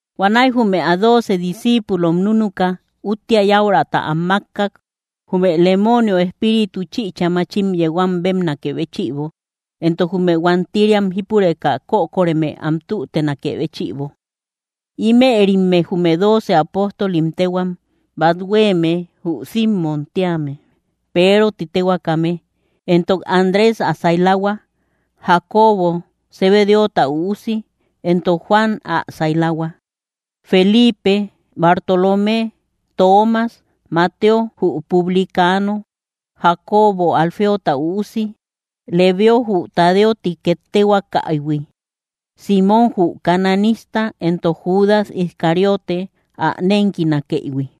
Huanäi jume ä dooce discíipulom núnuka, úttia yäuraata am mákkak jume lemoonio espíritu chïcha machim yeu am bébnakë béchïbo, entok jume huantiriam jípureka kökoreme am tütenakë béchïbo. Ímërimme jume dooce apóstolim téhuam: Bát huéeme jü Simmom tíame, Peero ti téhuaakame, entok Andrés ä sailahua, Jacobo Zebedeota üusi, entok Juan ä sailahua, Felipe, Bartolomé, Toomas, Mateo jü publicano, Jacobo Alfeota üusi, Lebeo jü Tadeo ti két téhuaakaïhui, Símmom jü cananista entok Judas Iscariote, ä nénkinakëihui.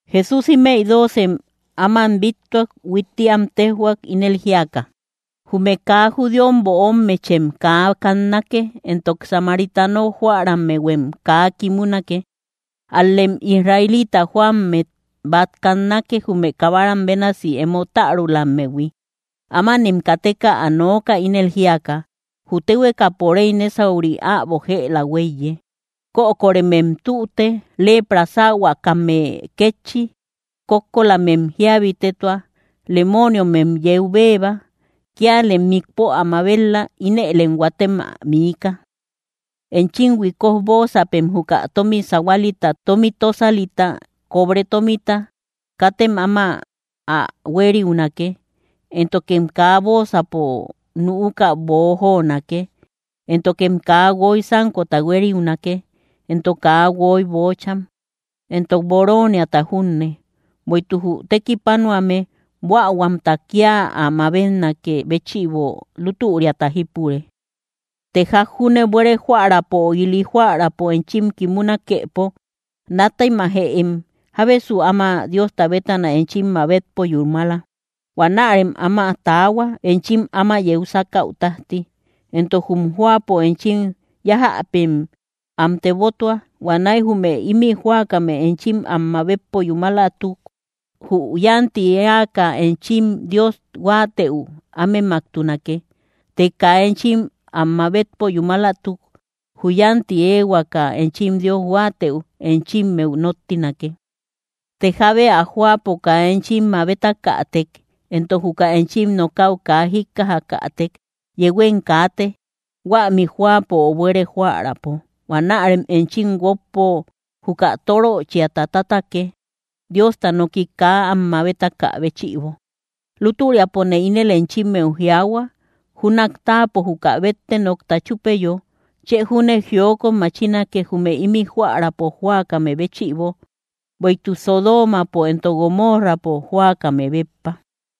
Jesús ímëi doocem áman bíttuak. Huitti am téjhuak, ínel jíaka: —Jume kaa judíom böommechem kaa kannake, entok samaritano jóärahuem kaa kimunake. Ál‑lem israelita jóammet bát kannake, jume kabaram bénasi emo tärulammehui. Ámanem kateka ä nooka, ínel jíaka: “Jü téhuekapo réy nésauri äbo jëla huéiye.” Kökoremem tüte, lepra sähuakame kétchi; kókkolamem jíabitetua, lemooniomem yeu béeba. Kíalem mikpo ä mabet‑la; ínëlem huatem ä miika. ’Enchim huikoj bóosapem juka tómi sahualita, tómi tósalita, cobre tómita, katem áma ä huériunake. Éntokem kaa bóosapo nüuka boojonake, éntokem kaa guoy sánkota huériunake, entok kaa guoy páares boocham, entok bóroniata junne; bueïtuk jü tekipanuame buähuamta kía ä mabetnakë béchïbo, lútüriata jípure. ’Të ják junne buére jóärapo, ö ili jóärapo enchim kimunakepo, nátemajëem jábesu áma Diosta bétana enchim mabetpo yúmala. Huanärem áma taahua, enchim áma yeu sákäu tájti. Entok jum jóapo enchim yájäpem am tebotua. Huanäi jume ímï jóakame enchim am mabetpo yúmalatuk, jü yánti éaka enchim Dios huáatëu ámemaktunake; të kaa enchim am mabetpo yúmalatuk, jü yánti éehuaka enchim Dios huáatëu enchimmeu nóttinake. Të jábe ä jóapo kaa enchim mabetakätek, entok juka enchim nokäu kaa jíkkajakätek, yehuem kaate huämi jóapo ö buére jóärapo, huanärem enchim guókpo juka tóröchiata tátake, Diosta noki kaa am mabetaka béchïbo. Lútüriapone ínel enchimmeu jiaahua, júnak táapo juka bette nokta chúpeyo, chë júne jiokot machinake, jume ímï jóärapo jóakame béchïbo, bueïtuk Sodoomapo entok Gomoorrapo jóakame béppa.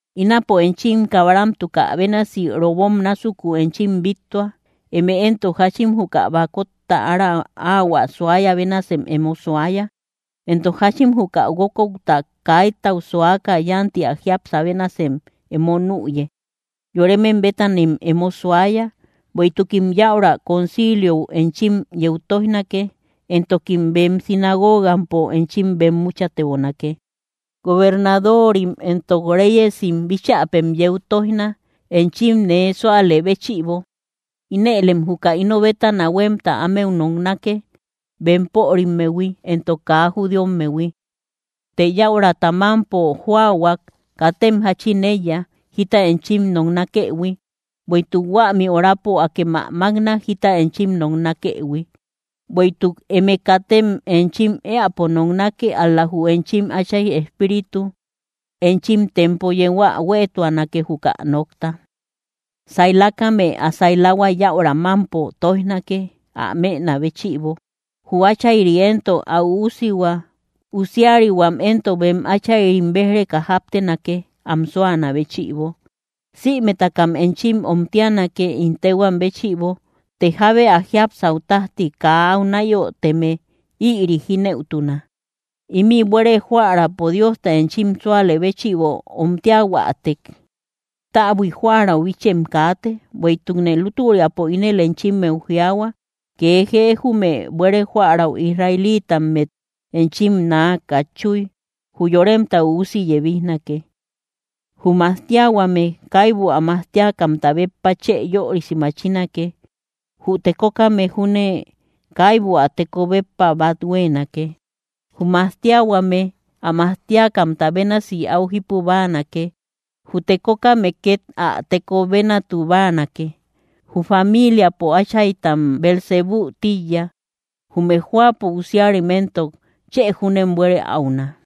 ’Ínapone enchim kabaramtukä bénasi robom násukun enchim bíttua. Eme éntok jáchin juka bakotta ára áhuä suaya bénasem emo suaya, entok jáchin juka guókouta kaitau suaka yánti ä jiapsä bénasem emo nüye. Yoremem bétanem emo suaya, bueïtukim yäura conciliou enchim yeu tóijnake, entokim bem sinagogampo enchim bemmuchatebonake. Gobernadorim entok réyesim bíchäpem yeu tóijna, enchim nee súalë béchïbo. Inëlem juka ino bétana huémta ámeu noknake, bempörimmehui entok kaa judíommehui. Të yäuraata mámpo joahuak, katem jáchin éiya, jita enchim noknakëhui; bueïtuk huämi horapo akem ä mákna, jita enchim noknakëhui. Bueïtuk eme katem enchim éäpo noknake, ál‑la jü enchim Áchay Espíritu enchim tempo yeu ä huéetuanake, juka nokta. ’Sailakame ä sailahua yäura mámpo tóijnake ä mënä béchïbo; jü áchayri éntok ä üusihua; usiarihuam éntok bem áchayrim béj‑reka jáptenake, am súanä béchïbo. Sïmetakam enchim omtianake ín téhuam béchïbo; të jábe ä jiapsäu tájti kaa áu náyoteme, ïri jínëutuna. Ímï buére jóärapo Diosta enchim súalë béchïbo omtiahuätek, täbui jóärau bichem kaate, bueïtukne lútüriapo ínel enchimmeu jiaahua: kee jee jume buére jóärau israelitammet enchim naa katchuy, jü Yoremta Üusi yebijnake. ’Jü majtiahuame kaibu ä majtiakamta béppa chë yörisi machinake; jü tekokame júne kaibu ä teko béppa bát huéenake. Jü majtiahuame ä majtiakamta bénasi áu jípu báanake; jü tekokame két ä teko bénatu báanake. Jü familiapo áchaytam Beelzebú tíiya; jume jóapo usiarim éntok chë júnem buére áuna.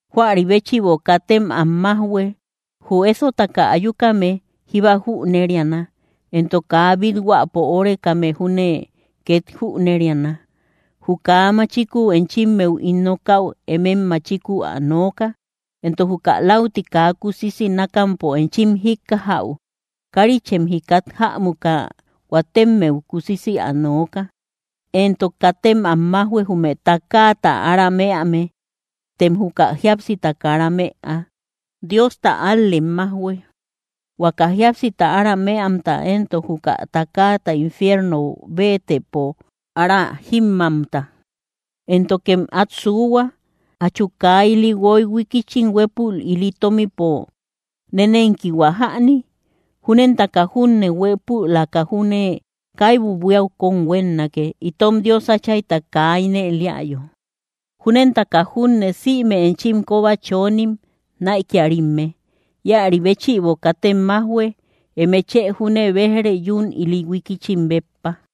’Juari béchïbo, katem am májhue; jü ésotaka ayukame jíba jüneriana, entok kaa bíthuäpo órekame júne két jüneriana. Juka kaa machikuu enchimmeu ín nokäu, emëem machikuu ä nooka; entok juka lauti kaa kusisi nákampo enchim jíkkajäu, kárichem jikat jämuka huatemmeu kusisi ä nooka. Entok katem am májhue jume takaata ára mëame, tem juka jíapsita kara mëa; Diosta ál‑lem majhuë, huaka jíapsita ára mëamta, entok juka takaata infierno béetëpo ára jímmamta. ’Éntokem át suuhua: ¿Jachu kaa ili guoy huikichim huépul ili tómipo nénenkihua jäni? Júnentaka junne, huépülaka júne kaibu buíau kón huénnake, itom Dios Áchayta kaa ínel éayo. Júnentaka junne, sïme enchim kóba chonim näikiarimme. Íäri béchïbo, katem májhue; eme chë júne béj‑re, yún ili huikichim béppa.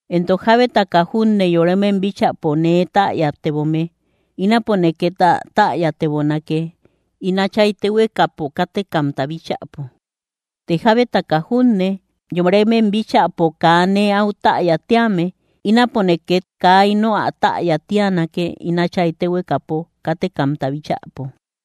’Entok jábetaka junne yoremem bíchäpo nee täyatebome, ínapone két ä täyatebonake, ín Áchay téhuekapo kátekamta bíchäpo. Të jábetaka junne yoremem bíchäpo kaa nee áu täya tíame, ínapone két kaa ino ä täya tíanake, ín Áchay téhuekapo kátekamta bíchäpo.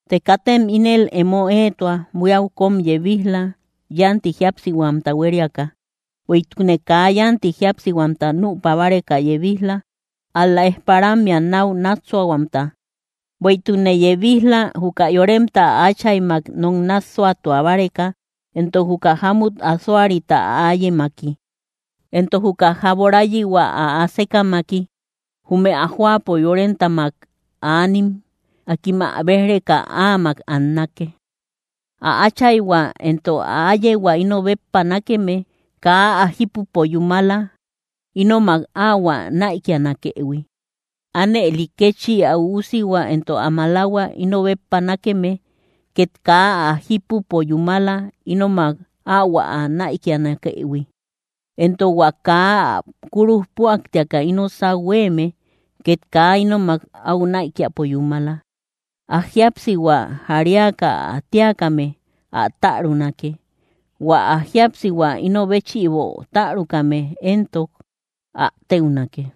’Të katem ínel emo éetua buíau kóm yebij‑la yánti jíapsihuamta huériaka; bueïtukne kaa yánti jíapsihuamta nüpa báreka yebij‑la, ál‑la ejparammea náu nássuahuamta. Bueïtukne yebij‑la, juka yoremta ä áchaymak nok nássuatua báreka, entok juka jámut asoahuarita ä áyemaki, entok jüka jaborayihua ä asekamaki. Jume ä jóapo yoremtamak aanim, akim ä béj‑reka áamak annake. ’Ä áchayhua entok ä áyehua ino béppa nákeme, kaa ä jípupo yúmala, ínomak áhuä näikianakëhui; ánëli kétchi ä üusihua entok ä malahua íno béppa nákeme, két kaa ä jípupo yúmala, ínomak áhuä näikianakëhui. Entok hua kaa ä kúruj püaktiaka íno sáu huéeme, két kaa ínomak áu näikiapo yúmala. Ä jíapsihua jariaka ä tíakame ä tärunake; hua ä jíapsihua ino béchïbo tärukame éntok ä téunake.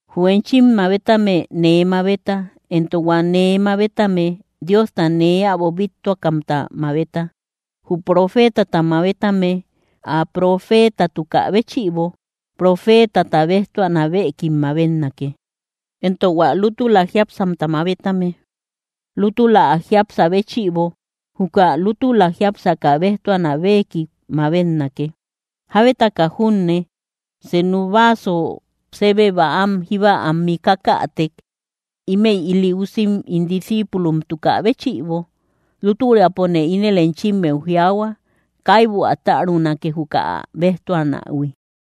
’Jü enchim mabetame, nee mabeta; entok hua nee mabetame, Diosta nee äbo bíttuakamta mabeta. Jü profeetata mabetame ä profeetatukä béchïbo, profeetata béjtuanä béekik mabetnake; entok hua lútula jiápsamta mabetame lútula ä jiapsä béchïbo, juka lútula jiápsaka béjtuanä béekik mabetnake. Jábetaka junne senu vaaso sébe bäam jíba am mikakätek, ímëi ili usim ín discíipulomtukä béchïbo, lútüriapone ínel enchimmeu jiaahua, kaibu ä tärunake, juka ä béjtuanähui.